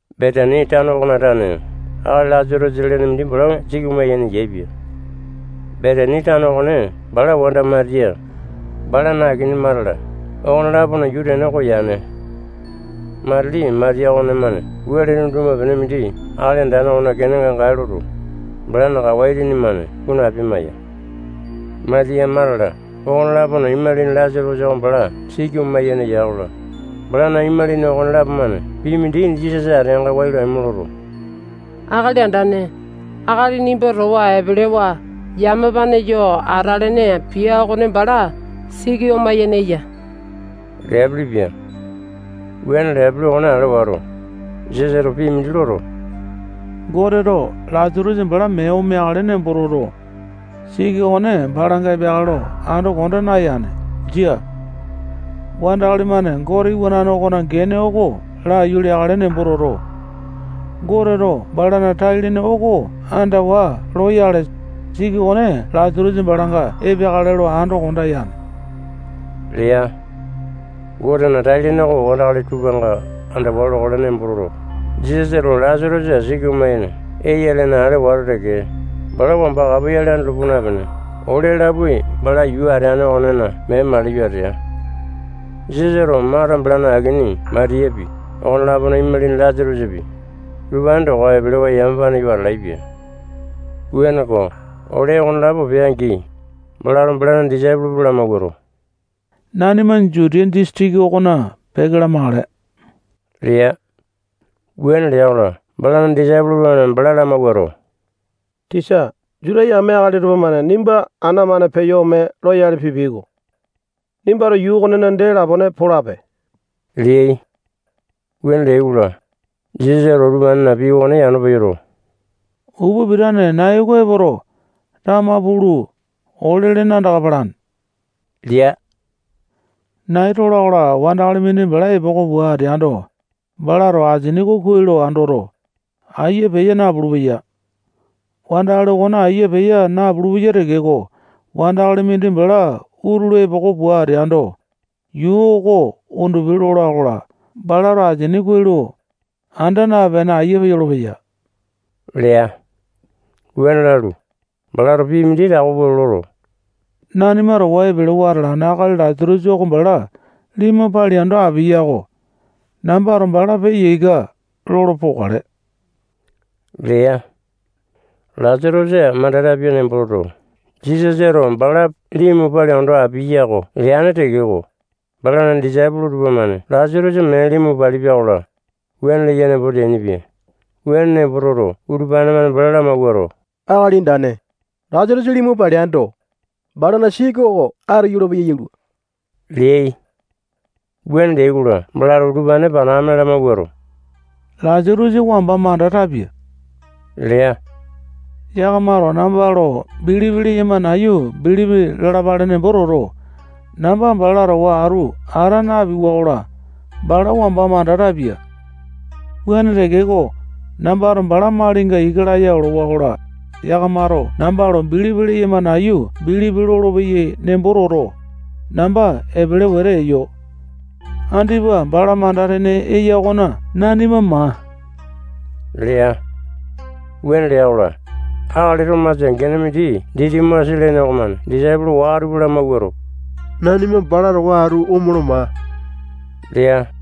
Betani tano okona tane akali Lasatosa lene mindi bala siki oma-yene yaepia. Betani tano okone bala wanda Matiya, balana akini Mata-la, okone-lapona yuu tene oko yane. Matili Matiya okonemane wele tunduma-pene mindi Akali Andane okona kenenga gae loto, balana kawa itini-mane kunu apia-maiya. Matiya, Mata-la, okone-lapona imalini Lasatosa oko bala siki oma-yene ya-kola, balana imalini okonelapo-mane pii mindi Jisasa ateanga wai lo aimo loto, Akali Andane, akali nimba towa epelewa yamapane yo atalene pia okone bala siki oma-yene eya leapelepia. Wuane leapele okone ale wato, Jisasato pii mindi loto, Goteto Lasatosa bala mee omeakale nembo toto, siki okone balanga epeakale lo ando konda nayane. Jia. Wandakali-mane Gote Iwanane okona gene oko laiyu leakale nembo toto, Goteto balana tai-lene oko andawa loyale, siki okone Lasatosa balanga epeakale lo ando konda yane lea. Gotena tai-lene oko wandakali tupanga andawa lokale nembo toto, Jisasato Lasatosa siki oma-yene eya lene ale wato teke, bala wamba kapoyale andolo puu napene, ole lapoai bala yuu ateane okonena mee maliyo atea. Jisasato Mata, balana akini Matiyapi, okone-lapona imalini Lasatosapi, utupane towa epelewa yamapane yo atalaepia. Wuaneko, ole okonelapo pea-angi, balato balana disaipolo tupa lamawuato, nanima Jutiya disitiki okona peke lamakale lea. Wuane lea-kola, balana disaipolo tupamane bala lamawuato, tisa, Juta yame akali tupamane nimba ana-mane peyo ome loyale pipiai-ko. Nimbato yuu okonena dee lapone polape leai. Wuane leai-kola, Jisasato utupanena pii okone yano peyoto, upa pitane nai oko epoto, tama pulu, ole-lene andaka palane lea. Nai tola-kola, wandakali mindi bala epoko pua ateando, balato asini oko kuai lo andoto, ayia peya napulu-peya. Wandakali okone ayia peya napulu-peya tekeko, wandakali mindi bala utulu epoko pua ateando, yuu oko undupi lola-kola, balato asini kuai lo anda napene, ayia peyolo-peya lea. Wuane lalu, balato pii mindi tako pua loto, nanima towa epelewa atalane akali Lasatosa oko bala limu palia ondo apiya-ko. Nambato bala peya ika lolo pokale lea. Lasatosa manda tapia nembo toto, Jisasato bala limu palia ondo apiaya-ko leane tekeko, balana disaipolo tupamane Lasatosa mee limu palipia-kola, wuane leya nembo teainipia. Wuane nembo toto, utupane-mane bala lamawuato, Akali Andane, Lasatosa limu paleando, balana siki oko atu yolopeya yalua leai. Wuane leai-kola, balato utupane panakame lamawuato, Lasatosa wamba manda tapia lea. Yakamato namba lo bilipi leyama nayu bilipi lalapale nembo toto, namba bala towa atu ata napiwa-kola, bala wamba manda tapia. Wuane tekeko, nambato bala malinga ika laya olowa-kola, yakamato namba lo bilipi leyama nayu bilipi lolopeyai nembo toto, namba epele wete eyo. Andipa bala manda-tene eya okona nanima maa lea. Wuane lea-kola, akali Tomasa gene mindi Ditimasa lene okomane disaipolo waka tupa lamawuato, nanima bala towa atu omolo maa lea.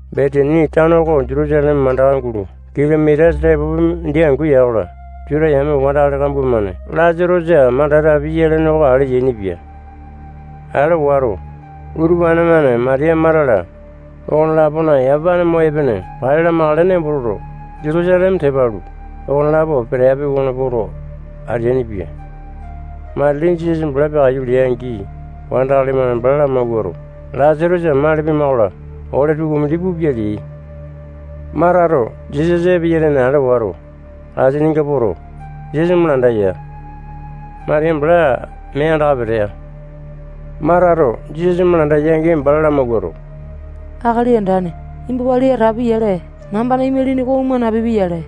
Betani tano oko Jutusaleme mandaka gulo kilomita tepopi mindi angu ya-kola, Juta yame wandakali kambua-mane Lasatosa manda tapia lene oko ale yainipia. Ale wato, utupane-mane Matiya, Mata-la, okone-lapona yamapane mo epene pale lamakale nembo toto, Jutusaleme tepa alu, okonelapo peteapi okona poto, ateainipia. Matili Jisasa bala peakaiyu lea-angi, wandakali-mane bala lamawuato, Lasatosa mali pima-kola, ole tukumindi pupia leai. Matato Jisasa epeya lene ale wato, asininga poto, Jisasa malanda ya. Matiya bala mee andaka petea. Matato Jisasa malanda ya-angi, bala lamawuato, Akali Andane, nimba wali atapi-yale, nambana imalini oko oma napipia-yale.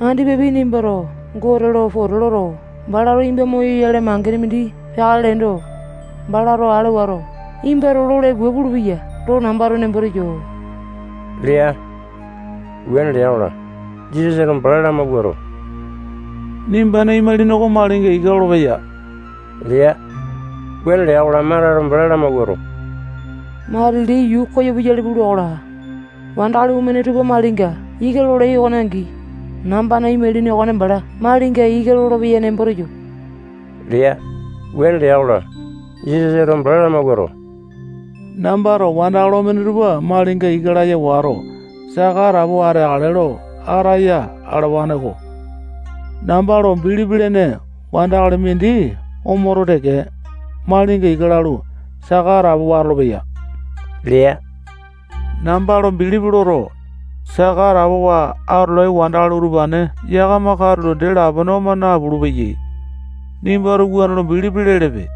Andipapi nimbato Gote lo pote loto, balato nimba moyoyale mangene mindi peakale leendo, balato ale wato, nimbato lole pua pulupeya lo nambato nembo teyo lea. Wuane lea-kola, Jisasato bala lamawuato, nimbana imalini oko malinga ika lolopeya lea. Wuane lea-kola, Matato bala lamawuato, matili yuu koyo puyale pula-kola, wandakali omene tupa malinga ika lolai okone angi, nambana imalini okone bala malinga ika lolopeya nembo teyo lea. Wuane lea-kola, Jisasato bala lamawuato, nambato wandakali omene tupa malinga ika laya wato, saka atapowa ateakale lo ataya alawane-ko. Namba lo bilipi lene wandakali mindi omoto teke, malinga ika lalu, saka atapowa atolopeya lea. Namba lo bilipi loto, saka atapowa atolai wandakali utupane yakama katulo dee lapone oma napulu-peyai. Nimbato wuane lo bilipi lelepe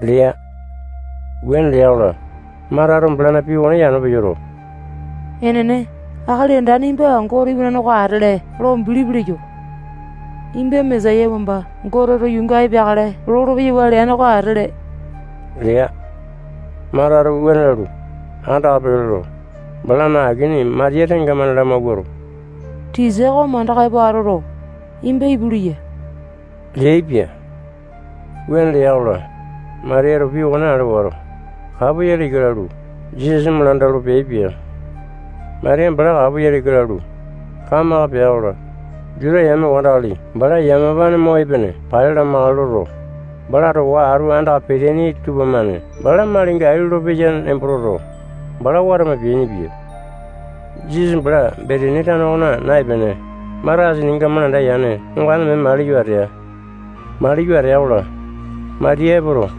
lea. Wuane lea-kola, Matato balana pii okone yano peyoto, enene, Akali Andane nimba Gote Iwanane oko atele lo bilipi leyo. Nimba Mesaya wamba Goteto yuunga epeakale lolo-peyawa leane oko atele lea. Matato wuane lalu, andaka peke loto, balana akini Matiya tengamane lamawuato, tisa oko mandaka epo atoto, nimba ipu leya leaipia. Wuane lea-kola, Matiyato pii okone ale wato, kapoyale ika lalu, Jisasa malanda olo peaipia. Matiya bala kapoyale ika lalu, kamaka pea-kola, Juta yame wandakali bala yamapane mo epene pale lamakale loto, bala towa atu andaka peteaini tupamane bala malinga ai lolo peya nembo toto, bala watama peainipia. Jisasa bala Betani tano okona naepene, Mata asininga malanda yane ongane mee maliyo atea. Maliyo atea-kola, Matiya epoto,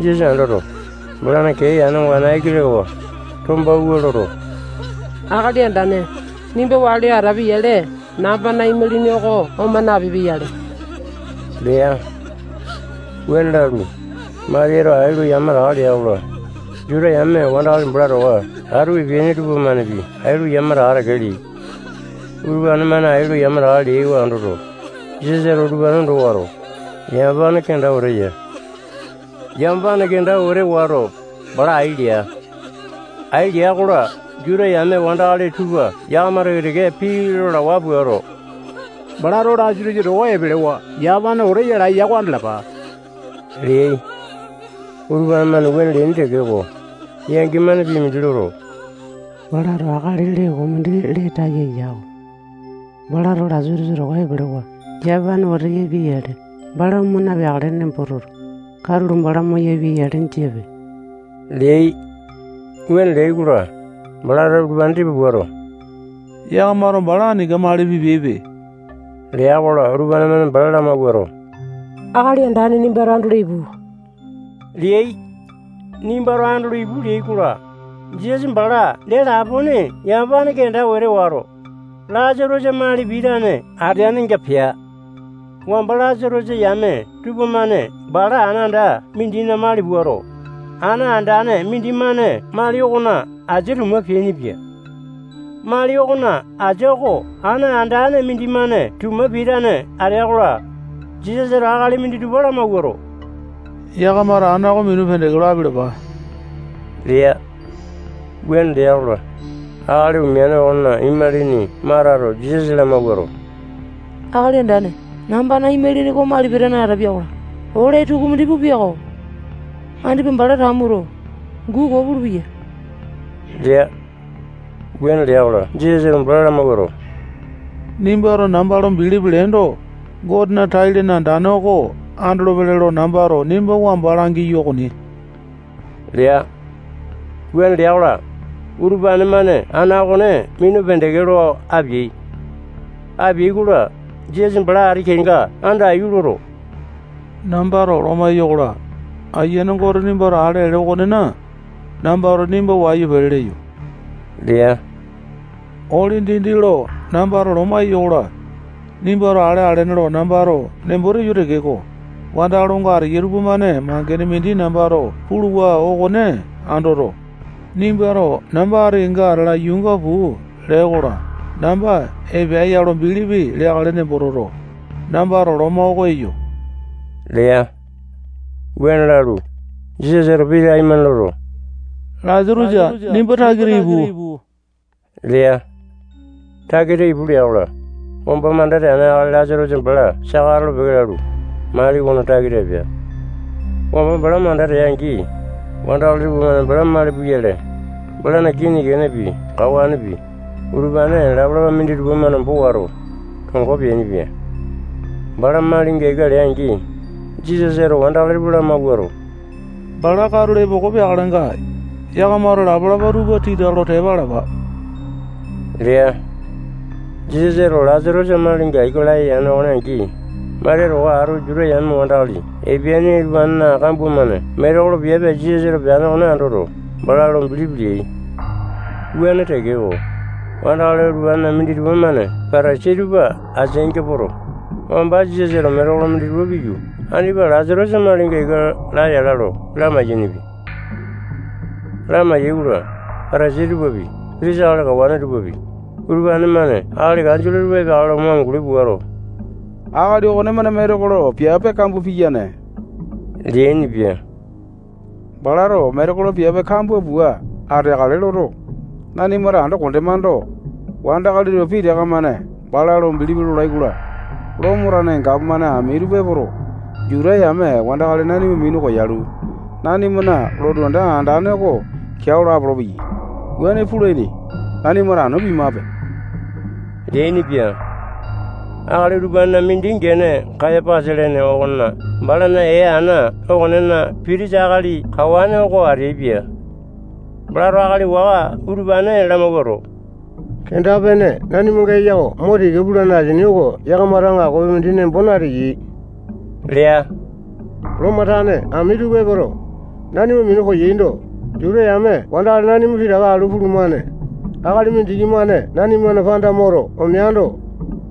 Jisasa andoto, balana kee yane ongane aiki lekawa, tombawua loto, Akali Andane, nimba wali atapi-yale, nambana imalini oko oma napipia-yale lea. Wuane lalu, Matiyato ai lo yamataka lea-kola, Juta yame wandakali bala towa atu epeaini tupamanepi ai lo yamataka teke leai. Utupane-mane ai lo yamataka leai oko andoto, Jisasato utupane ondo wato, yamapane kenda wete ya. Yamapane kenda wete wato, bala ai lea. Ai lea-kola, Juta yame wandakali tupa yakama teke-teke pii lalawa puato, balato Lasatosa towa epelewa yamapane wete yalaeya oko andalapa leai. Utupane-mane wuane leaini tekeko, yangi-mane pii mindi loto, balato akali lee koo mindi lee taya yako. Balato Lasatosa towa epelewa yamapane wete yapia-yale, bala oma napeakale nembo toto, katulo bala moyapia-yale jiape leai. Wuane leai-kola, balato utupane tipa puato, yakamato bala aninga mali pipiaipe lea-kola, utupane-mane bala lamawuato, Akali Andane nimbato andolo ipu leai. Nimbato andolo ipu leai-kola, Jisasa bala dee lapone yamapane kenda wete wato, Lasatosa mali pitane yanenga pea. Wamba Lasatosa yame tupamane bala ana anda mindina mali puato, ana andane mindimane mali okona asia tuma peainipia. Mali okona asia oko ana andane mindimane tuma pitane atea-kola, Jisasato akali minditupa lamawuato, yakamato ana oko minu pendeke lo apialapa lea. Wuane lea-kola, akali omeane okona imalini Matato Jisasa lamawuato, Akali Andane, nambana imalini oko mali pitane atapia-kola, ole tukumindi pupia-ko. Andipa bala tamuto, guu koo pulupeya lea. Wuane lea-kola, Jisasato bala lamawuato, nimbato namba lo bilipi leendo, Gotena tai-lene andane oko andolopele lo nambato nimba wamba langiyo okoni lea. Wuane lea-kola, utupane-mane ana okone minu pendeke lo apeai. Apeai-kola, Jisasa bala ati kenga andaiyu loto, nambato loma eyo-kola, Ayiane Gote nimbato ale alene okonena, nambato nimba wayu pele leyo lea. Ole dindi lo nambato loma eyo-kola, nimbato ale alene lo nambato nembo teyo tekeko, wandakali onga ateyai tupamane mangene mindi nambato puluwa okone andoto, nimbato namba ati kenga atala yuunga puu lee-kola, namba epea ya lo bilipi leakale nembo toto, nambato loma oko eyo lea. Wuane lalu, Jisasato pii taimane loto, Lasatosa, nimba takita ipu lea. Takita ipu lea-kola, wamba manda teane akali Lasatosa bala saka atolo-peke lalu, mali okona takita epea. Wamba bala manda tea-angi, wandakali tupamane bala mali puyale, balana kinipi, kenepi, kawanepi, utupane lapa-lapa minditupa-mane ombo wato, tongo peainipia. Bala malinga ika lea-angi, Jisasato wandakali tupa lamawuato, bala katulo epoko peakalenga, yakamato lapa-lapa tupa tita lo tepa alapa lea. Jisasato Lasatosa malinga ika laya yane okone angi, Matiya towa atu Juta yame wandakali epeaini utupanena kambua-mane metekolo piape Jisasato peane okone andoto, bala lo bilipi leai. Wuane tekeko, wandakali utupanena minditupa-mane Patasai tupa ateainga poto, wamba Jisasato metekolo minditupa piyu, andipa Lasatosa malinga ika laya ala lo lamai-yainipia. Lamai-yaikola, Patasai tupapi, pitisa akali kawane tupapi, utupane-mane akali kanjole tupa epeakale lo mo amunguli puato, akali okonemane metekolo piape kambua piyane leainipia. Balato metekolo piape kambua pua ateakale loto, nanimato ando kondemando, wandakali tupa pitaka-mane bala lo bilipi lolai-kola, Lomo tane gapomane ami tupa epoto, Juta yame wandakali nanima minu koyalu, nanimana lotu anda andane oko keao lo apolopeyai. Wuane pulaini nembo toto, nanimato anu piamape leainipia. Akali utupanena mindi gene Kayapasa lene okone bala ee ana okonena pitisa akali kawane oko ateaipia. Balato akali waka utupane lamawuato, kenda-pene nanimanga eya oko mo tika pulane asini oko yakamato aŋakopi mindi nembo nateyai lea. Lomo tane ami tupa epoto, nanima minu koyaindo, Juta yame wandakali nanima pitaka alu pulumane. Akali mindiki-mane nanimana panda moto omeando,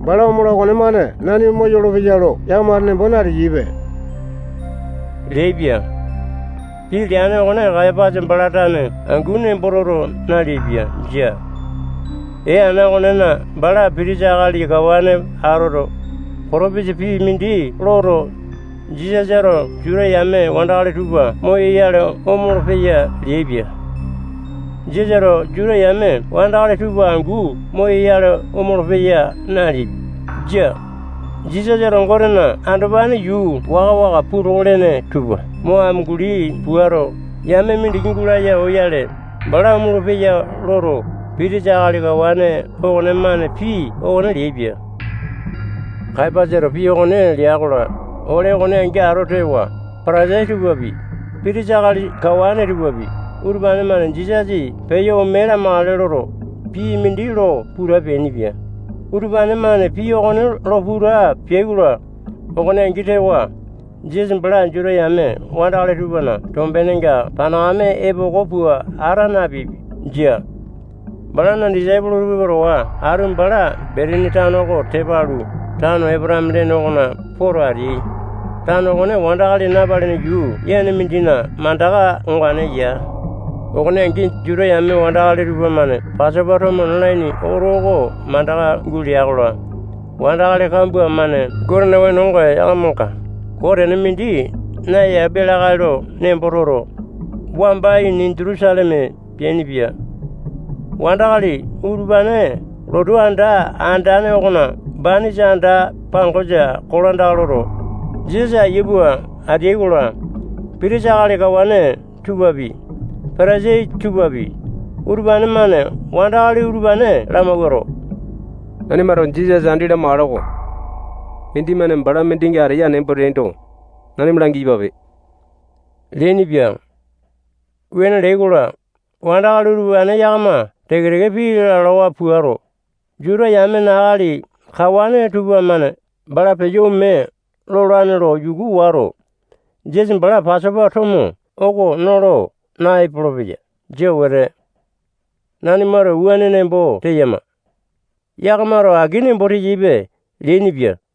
bala omola okonemane nanima moyolo-peya lo yakamato nembo nateyaipe leaipia. Pii leane okone Kayapasa bala tane angu nembo toto naleaipia. Jia. Ee ana okonena bala pitisa akali kawane atoto, potopisa pii mindi loto, Jisasato Juta yame wandakali tupa moyoyale omolo-peya leaipia. Jisasato Juta yame wandakali tupa angu moyoyale omolo-peya naleaipia. Jia. Jisasato Gotena andopane yuu waka-waka tupa puu toko lene tupa mo amunguli puato, yame mindiki gulaya oyale, bala omolo-peya loto, pitisa akali kawane okonemane pii okone leaipia. Kayapasato pii okone lea-kola, ole okone angi ato tewa, Patasai tupapi, pitisa akali kawane tupapi, utupane-mane Jisasa peyo ome lamakale loto, pii mindi lo puta peainipia. Utupane-mane pii okone lo puta peai-kola, okone angi tewa, Jisasa bala Juta yame wandakali tupana tombenenga panakame epoko pua ata napea. Jia. Balana disaipolo tupa towa atu bala Betani tano oko tepa alu, tano Epotame lene okona poto ateai. Tano okone wandakali napalene yuu yane mindina mandaka ongane ya. Okone angi, Juta yame wandakali tupamane Pasopa tomo nalaini oto oko mandaka gulea-kola, wandakali kambua-mane Gotena wenonga yakamanga koo tene mindi nayapia lakae lo nembo toto, wamba ini Jutusaleme peainipia. Wandakali utupane lotu anda andane okona banisa anda-pangosa kolandaka loto, Jisasa ayia pua ateai-kola, pitisa akali kawane tupapi, Patasai tupapi, utupane-mane wandakali utupane lamawuato, nanimato Jisasa andi lamakale-ko. Mindimane bala mindinga ateya nembo teaindo, nanima langi-yapape leainipia. Wuane leai-kola, wandakali utupane yakama teke-teke pii lalawa puato, Juta yamena akali kawane tupamane bala peyo ome lolane lo yuku wato, Jisasa bala Pasopa tomo oko nolo naepolo-peya. Jia wete. Nanimato wuane nembo teyama. Yakamato aki nembo teyaipe leainipia.